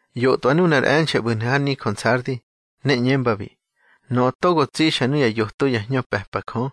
ꞌYotꞌwa nunar e̱nxe̱ ꞌbu̱hnu̱ har nijö Nsardi, ne ꞌñembabi: Nöꞌö togo tsixa nuya yoto ya hñö pe̱pa Jö,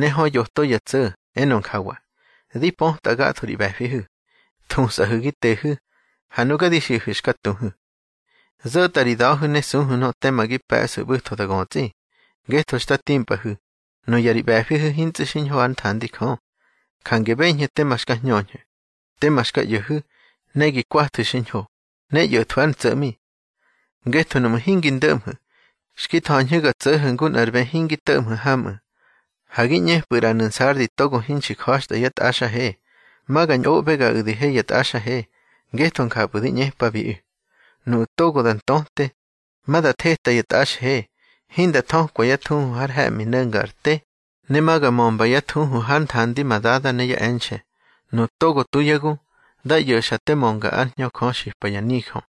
ne hö yoto ya tso̱, enö njawa: Di pötꞌa gatho ri ꞌbe̱fihu̱. Thusꞌahu̱ gi tehu̱, ha nuga di xiꞌahu̱ xka tuhu̱. Zo̱tꞌa ri da̱hu̱ ne suhu̱ nöꞌö tema gi pe̱ꞌsu̱ ꞌbu̱tho da götsꞌi. Ngetho xta timpꞌahu̱, nuya ri ꞌbe̱fihu̱ hintsꞌu̱ xiñho hár nthandi Jö. Jange beñhu̱ tema xka hñöñhu̱, tema xka ꞌyo̱hu̱, ne gi kwathu̱ xiñho, ne ꞌyo̱thwu̱ ár ntso̱ꞌmi. Ngetho nuꞌmu̱ hingi ndo̱ꞌmhu̱, xki tha̱ñhu̱ ga tso̱ho̱ ngu nꞌar bë hingi to̱ꞌmhu̱ hamꞌu̱. Ha gi ꞌñepꞌu̱ ꞌranu̱ Nsardi togo hinxi ja̱xtꞌa yá tꞌaxhe. Ma ga ñꞌoꞌbegaꞌu̱ di he ya tꞌaxhe, ngetho njapꞌu̱ di ꞌñepabiꞌu̱. Nuꞌu̱ togo da ntöte, ma da theta ya tꞌaxhe, hinda thökwa yá thuhu har he̱ꞌmi no̱nga ar te, ne ma ga mömba yá thuhu hár nthandi ma Dada ne yá e̱nxe̱. Nuꞌu̱ togo tu yá gu, dá ꞌyo̱xa te mönga ár Hñö Jö xipa ya nijö.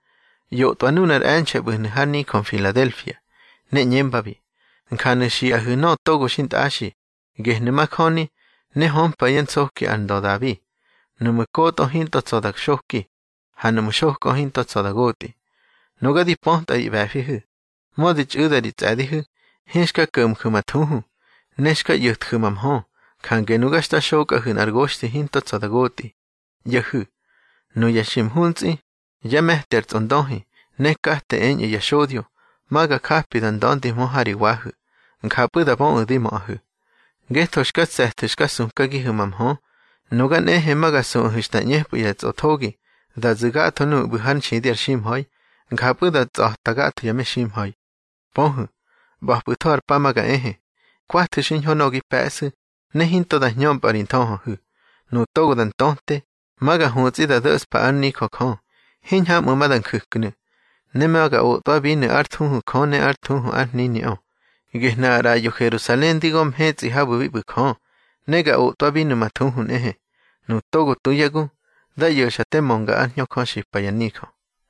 ꞌYotꞌwa nunar e̱nxe̱ ꞌbu̱hnu̱ har nijö Mfiladelfia, ne ꞌñembabi: Njanu̱ xiꞌahu̱ nöꞌö togo xintꞌaxi, gehnu̱ majöni, ne hömpa yá nsoki ar ndö Dabi. Nuꞌmu̱ kotꞌö hinto tsa̱ da xoki, ha nuꞌmu̱ xokꞌö hinto tsa̱ da gotꞌi. Nuga di pötꞌa ri ꞌbe̱fihu̱. Mödi txꞌu̱da ri tsꞌe̱dihu̱, hinxka ko̱mju̱ ma thuhu, ne xka ꞌyo̱tju̱ ma mhö. Jange nuga xta xokꞌahu̱ nꞌar goxthi hinto tsa̱ da gotꞌi. ꞌYo̱hu̱. Nuya xi mhuntsꞌi, yá me̱ti ar tsꞌondöhi, ne kate eñꞌu̱ ya xodyo, ma ga japi da nda̱ndihmö ha ri wahu̱. Njapꞌu̱ da böꞌu̱ di möꞌahu̱. Ngetho xka tse̱thu̱ xka sukagihu̱ ma mhö, nuga nꞌehe ma ga suꞌahu̱ xta ꞌñepꞌu̱ ya tsꞌothogi da zu̱ gatho nuꞌu̱ ꞌbu̱ hár nxidi ar ximha̱i, njapꞌu̱ da tsꞌa̱ta gatho ya meximha̱i. Pöhu̱, ꞌba̱pꞌu̱tho ar pa ma ga ehe. Kwathu̱ xiñho nöꞌö gi pe̱ꞌsu̱, ne hinto da hñömpꞌa ri nthöhöhu̱. Nuꞌu̱ togo da ntöte, ma ga hutsꞌi da do̱ꞌspa ár nijö Jö, hiñhamꞌu̱ ma da nju̱knu̱. Ne ma ga otꞌwabinu̱ ár thuhu Jö ne ár thuhu ár hniniꞌö, gehnu̱ ar ꞌraꞌyo Herusalen di gö mhetsꞌi habu̱ bi ꞌbu̱ Jö, ne ga otꞌwabinu̱ ma thuhu nꞌehe. Nuꞌu̱ togo tu yá gu, dá ꞌyo̱xa te mönga ár Hñö Jö xipa ya nijö.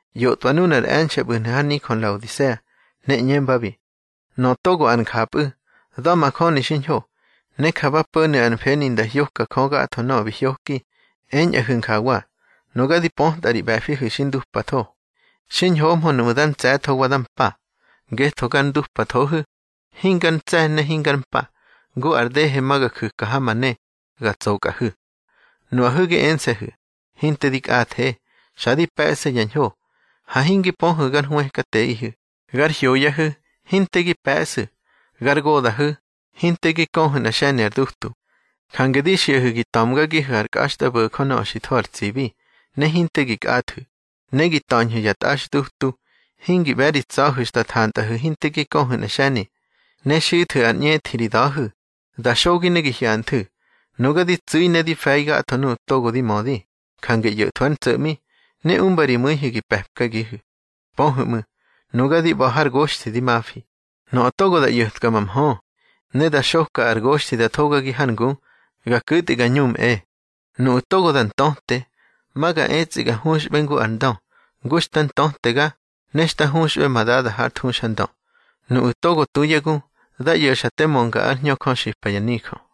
ꞌYotꞌwa nunar e̱nxe̱ ꞌbu̱hnu̱ har nijö Nlaodisea, ne ꞌñembabi: Nöꞌö togo ar Njapꞌu̱, da̱majöni xiñho, ne ja ba po̱nu̱ ar mfeni nda hyoka Jö gatho nöꞌö bi hyoki, eñꞌahu̱ njawa: Nuga di pötꞌa ri ꞌbe̱fihu̱ xi ndupatho. Xiñhohmö nuꞌmu̱ dá ntse̱tho wa dá mpa. Ngetho gar ndupathohu̱, hingar ntse̱ ne hingar mpa, ngu ar dehe ma ga ju̱ka ha ma ne, ga tsokꞌahu̱. Nuꞌahu̱ gi ense̱hu̱: Hinte di kꞌathe, xa di pe̱ꞌse ya ñho. Ha hingi pöhu̱ gar hwëkateꞌihu̱, gar hyoyahu̱, hinte gi pe̱ꞌsu̱, gar goda̱hu̱, hinte gi köhu̱ nꞌar xe̱ni ar dutu. Jange di xiꞌahu̱ gi ta̱mgagihu̱ ar kꞌaxtꞌabo̱jö nöꞌö xi tho har tsibi, ne hinte gi kꞌathu̱. Ne gi ta̱ñhu̱ ya tꞌaxdutu, hingi ꞌbe̱ ri tsa̱hu̱ xta thantꞌahu̱ hinte gi köhu̱ nꞌa xe̱ni. Ne xithu̱ ar ꞌñethi ri da̱hu̱, da xogi ne gi hyanthu̱. Nuga di tsu̱i ne di fe̱i gatho nuꞌu̱ togo di mödi, jange ꞌyo̱thwu̱ ár ntso̱ꞌmi, ne umba ri mu̱ihu̱ gi pe̱pkagihu̱. Pöhu̱ ꞌmu̱, nuga di ꞌba̱ har goxthi di mafi. Nöꞌö togo da ꞌyo̱tka ma mhö, ne da xoka ar goxthi da thogagi hár ngu, ga ku̱tꞌi ga ñumꞌe. Nuꞌu̱ togo da ntöte, ma ga etsꞌi ga huxꞌbe ngu ar ndö, ngu xta ntötega, ne xta huxꞌbe ma Dada hár thuxandö. Nuꞌu̱ togo tu yá gu, dá ꞌyo̱xa te mönga ár Hñö Jö xipa ya nijö.